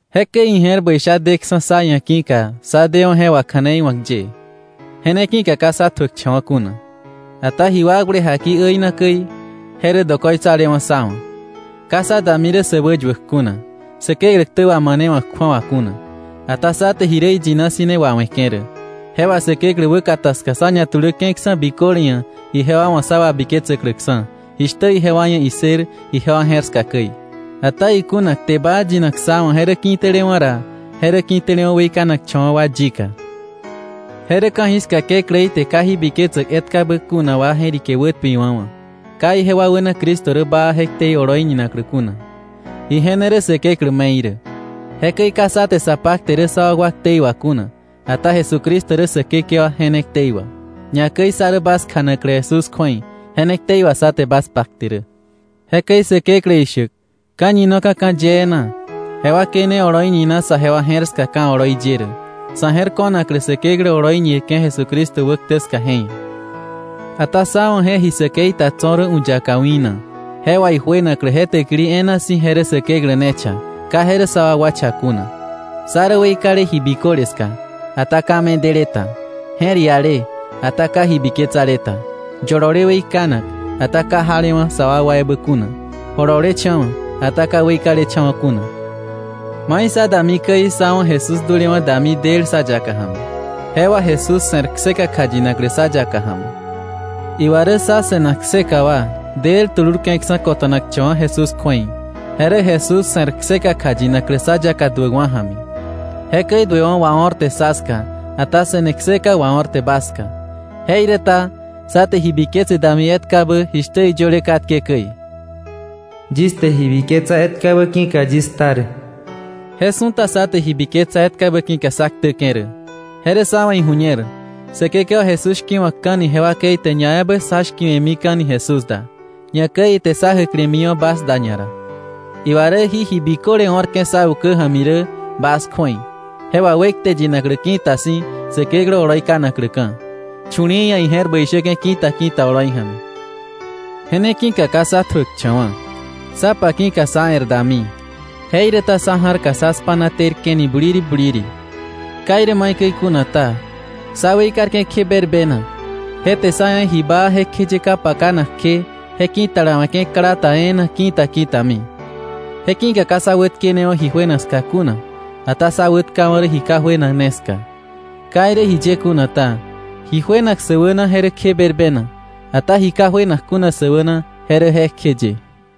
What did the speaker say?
Jekäi ije̱r bäi sha deksa̱ sá ia̱ ki̱ka, sá dewa̱ je wakja̱neiwa̱k ye. Je ne ki̱ka ka sá tjuäkcha̱wa̱ kuna. Ata ji wakble jaki äina käi, je rä dokoitsalewa̱ sá wa̱. Ka sá dami rä sä wäyuäk kuna, Säkeklä ktä wamanewa̱k kju̱awa kuna. Ata sá te ji rä iyina si̱ ne wawe̱ke̱ rä. Je wà Säkeklä wäkata ska sá ñatuläke̱ksa̱ biköle ia̱ ijewa wa̱ sá wabiketsäkläksa̱ jishtä ijewa ia̱ issër ijewa je̱r ska käi. Ata ikuna kte baa yinak sá wa̱ je rä ki̱telewa̱ ra, je rä ki̱telewa̱ weikanakcha̱wa̱ wa yika. Je rä ka̱jiska kekläí te ka ji biketsäk etkabä kuna wa je̱rike wätuiwa̱wa̱, ka ijewa wäna Cristo rä baa je ktei oloi ñinaklä kuna. Ije ne rä Säkeklä me̱i rä. Jekäi ka sá te sa pakte rä sá wakwa ktei wà kuna, ata Jesucristo rä Säkekewa je ne ktei wà, ñakäi sá rä bas kjanaklä Jesús kju̱ei, je ne ktei wà sá te bas pakte rä. Jekäi Säkeklä ishäk: “Ka̱ñinoka̱ ka̱ yee na”, je wakei ne oloi ñina saje wa je̱r ska ka̱ oloi ye rä, sa̱ je̱r ko̱naklä Säkeklä oloi ñirke̱ Jesucristo wäktä ska je ia̱. Ata sá wa̱ je ji säkei ta tso̱ rä u̱ yaka u̱í na, je wà ijuenaklä je täkili e̱e̱na si̱ je rä Säkeklä ne cha, ka je rä sá wakwa cha kuna. Sá rä weikale ji biköle ska, ata ka medele ta; je̱r iale, ata ka ji biketsale ta, yolole weikanak, ata ka jalewa̱ sá wakwa ebä kuna, jololecha̱wa̱, ata ka weikalecha̱wa̱ kuna. Mai sá dami käi sá wa̱ Jesús dulewa̱ dami del sá yaka ja̱mi, je wà Jesús se̱r kseka kjayinaklä sá yaka ja̱mi. Iwa rä sá se̱nak kseka wa del tulurke̱ksa̱ ko̱ta̱nakcha̱wa̱ Jesús kju̱ei, je rä Jesús se̱r kseka kjayinaklä sá yaka duäkwa̱ ja̱mi. Jekäi duewa̱ wao̱rte sá ska, ata se̱ne kseka wao̱rte bas ska. Jeiräta, sá te ji biketse dami etkabä jishtä iyöle katke käi: “Yis te ji biketsa etkabä ki̱ka yis kta rä.” Je su̱ta sá te ji biketsa etkabä ki̱ka sá ktäke̱ rä, je rä sá wa̱ iju̱ñer Säkekewa Jesús shki̱wa̱kka̱ni je wakei te ñaebä sá shki̱we̱mika̱ni Jesús da, ñakäi ite sá jäklemiwa̱ bas da ñara. Iwa rä jí ji biköle o̱rke̱ sá ukä ja̱mi rä bas kju̱ei, je wà wekte yinaklä ki̱ta si̱ Säkeklä oloi kanakläka̱, chu̱li̱i̱ ia̱ ije̱r bäi shäke̱ ki̱ta ki̱ta oloi ja̱mi. Je ne ki̱ka ka sá tjuäkcha̱wa̱. Sá pa ki̱ka sá e̱r dami, jeiräta sá ja̱rka sá spa̱na terke̱ni buliri buliri. Ka irä maikäi kuna ta, sá weikarke̱ kje berbena, je te sá ia̱ ji baa jekjeye ka pakanak kje, je ki̱talawe̱ke̱ kala ta e̱e̱na ki̱ta ki̱tami. Je ki̱ka ka sá wätkenewa̱ ji juenak ska kuna, ata sá wätkawa̱ rä ji ka juenak ne ska. Ka irä jiye kuna ta, ji juenak sä wäna je rä kje berbena, ata ji ka juenak kuna sä wäna je rä jekjeye.